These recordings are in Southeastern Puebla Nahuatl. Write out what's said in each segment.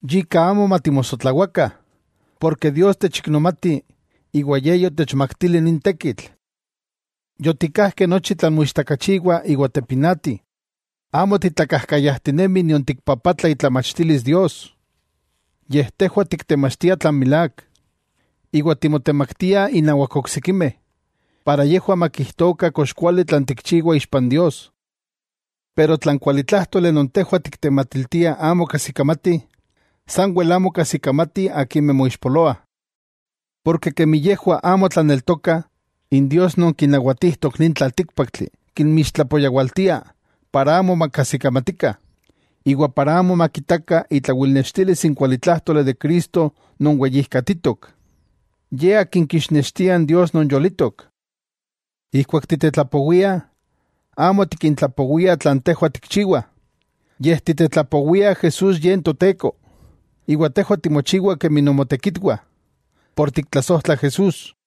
Yika amo matimosotlawakah, porke Dios, techiknomati iwa Ye yotechmaktili nin tekitl. Yotikkajkeh nochi tlan moichtakachiwa iwa tepinati. Amo titlakajkayajtinemih nion tikpapatlah itlamachtilis Dios. Yej tejwah tiktemachtiah tlan milák, iwa timotemaktiah innawak oksikimeh, para yejwah makijtokah kox kuali tlan tikchiwah ixpa n Dios. Pero tla n kualitlájtoli non tejwah tiktematiltiah amo kajsikamati, sanwel amo kajsikamatih akimeh moixpoloah. Porke kemi yejwah amo tlaneltokah, n dios non kinawatijtok nin tlaltíkpaktli kinmixtlapoyawaltia para amo makajsikamatikah, iwa para amo makitakah itlawilnextilis n kualitlájtoli de Cristo non weyijkatitok, Ye Akin kixnextia n Dios non yolitok. Ijkuak titetlapowiah, amo tikintlapowiah tlan tejwah tikchiwah, yej titetlapowiah Jesús Ye n Toteko, iwa tejwah timochiwah kemi nomotekitwah, por tiktlasojtla Jesús.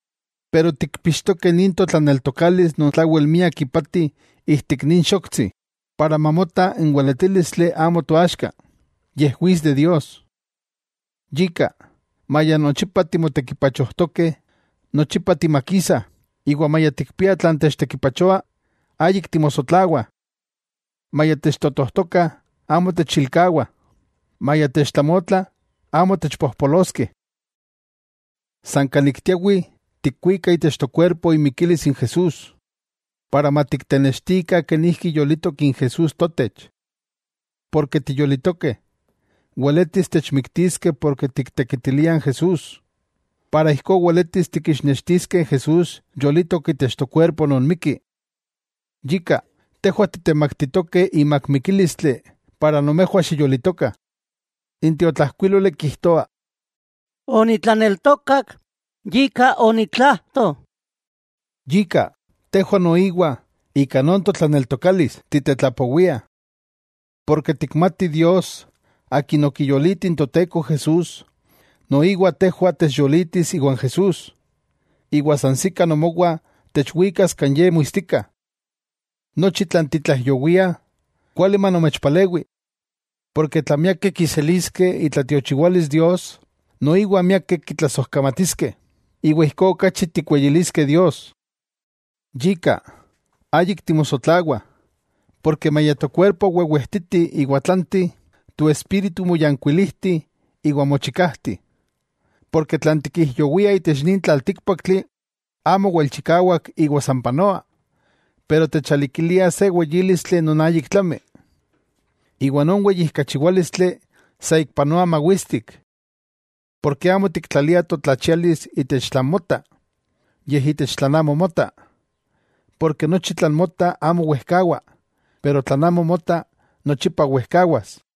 Pero tikpixtokeh nin totlaneltokalis non tlawel miak ipati ijtik nin xoktsi, para mamota n weletílistli amo toaxka, yej wits de Dios. Yika, maya nochipa timotekipachojtokeh, nochipa timakisah; iwa maya tikpiah tlan techtekipachoa, ayik timosotlawah. Maya techtotojtokah, amo techilkawa, maya techtlamotla, amo techpojpoloskeh. San kan ik tiawih, tikwikah itech tokuerpo imikilis n Jesús, para matiktenextikah kenijki yolitok n Jesús totech. Porke tiyolitokeh, weletis techmiktiskeh porke tiktekitiliah n Jesús, para ijkó weletis tikixnextiskeh Jesús yolitok itech tokuerpo non mikki. Yika tejwah titemaktitokeh imak mikílistli para nomejwah xiyolitokah. N tiotlajkuíloli kijtoa: “Onitlaneltokak, yika onitlajto.” Yika, tejwah noiwa, ika non totlaneltokalis, titetlapowiah. Porke tikmatih Dios, Akin okiyoliti n Toteko Jesús, noiwa tejwah techyolitis iwan Jesús, iwa sansikah nomowah techwikas kan ye muistika. Nochi tlan titlaijyowiah, kuali manomechpalewi. Porke tla miakeh kiseliskeh itlatiochiwalis Dios, noiwa miakeh kitlasojkamatiskeh, iwa ijkó okachi tikweyiliskeh Dios. Yika, ayik timosotlawah, porke maya tokuerpo wewejtiti iwa tlanti, toespíritu moyankuilijti iwa mochikajti. Porke tlan tikijyowiah itech nin tlaltíkpaktli, amo wel chikawak iwa san panoa. Pero techalikilia se weyílistli non ayik tlami, iwa non weyijkachiwálistli saikpanoa mawistik. Porke amo tiktlaliah totlachialis itech tlan mota, yej itech tlan amo mota. Porke nochi tlan mota amo wejkawa, pero tlan amo mota, nochipa wejkawas.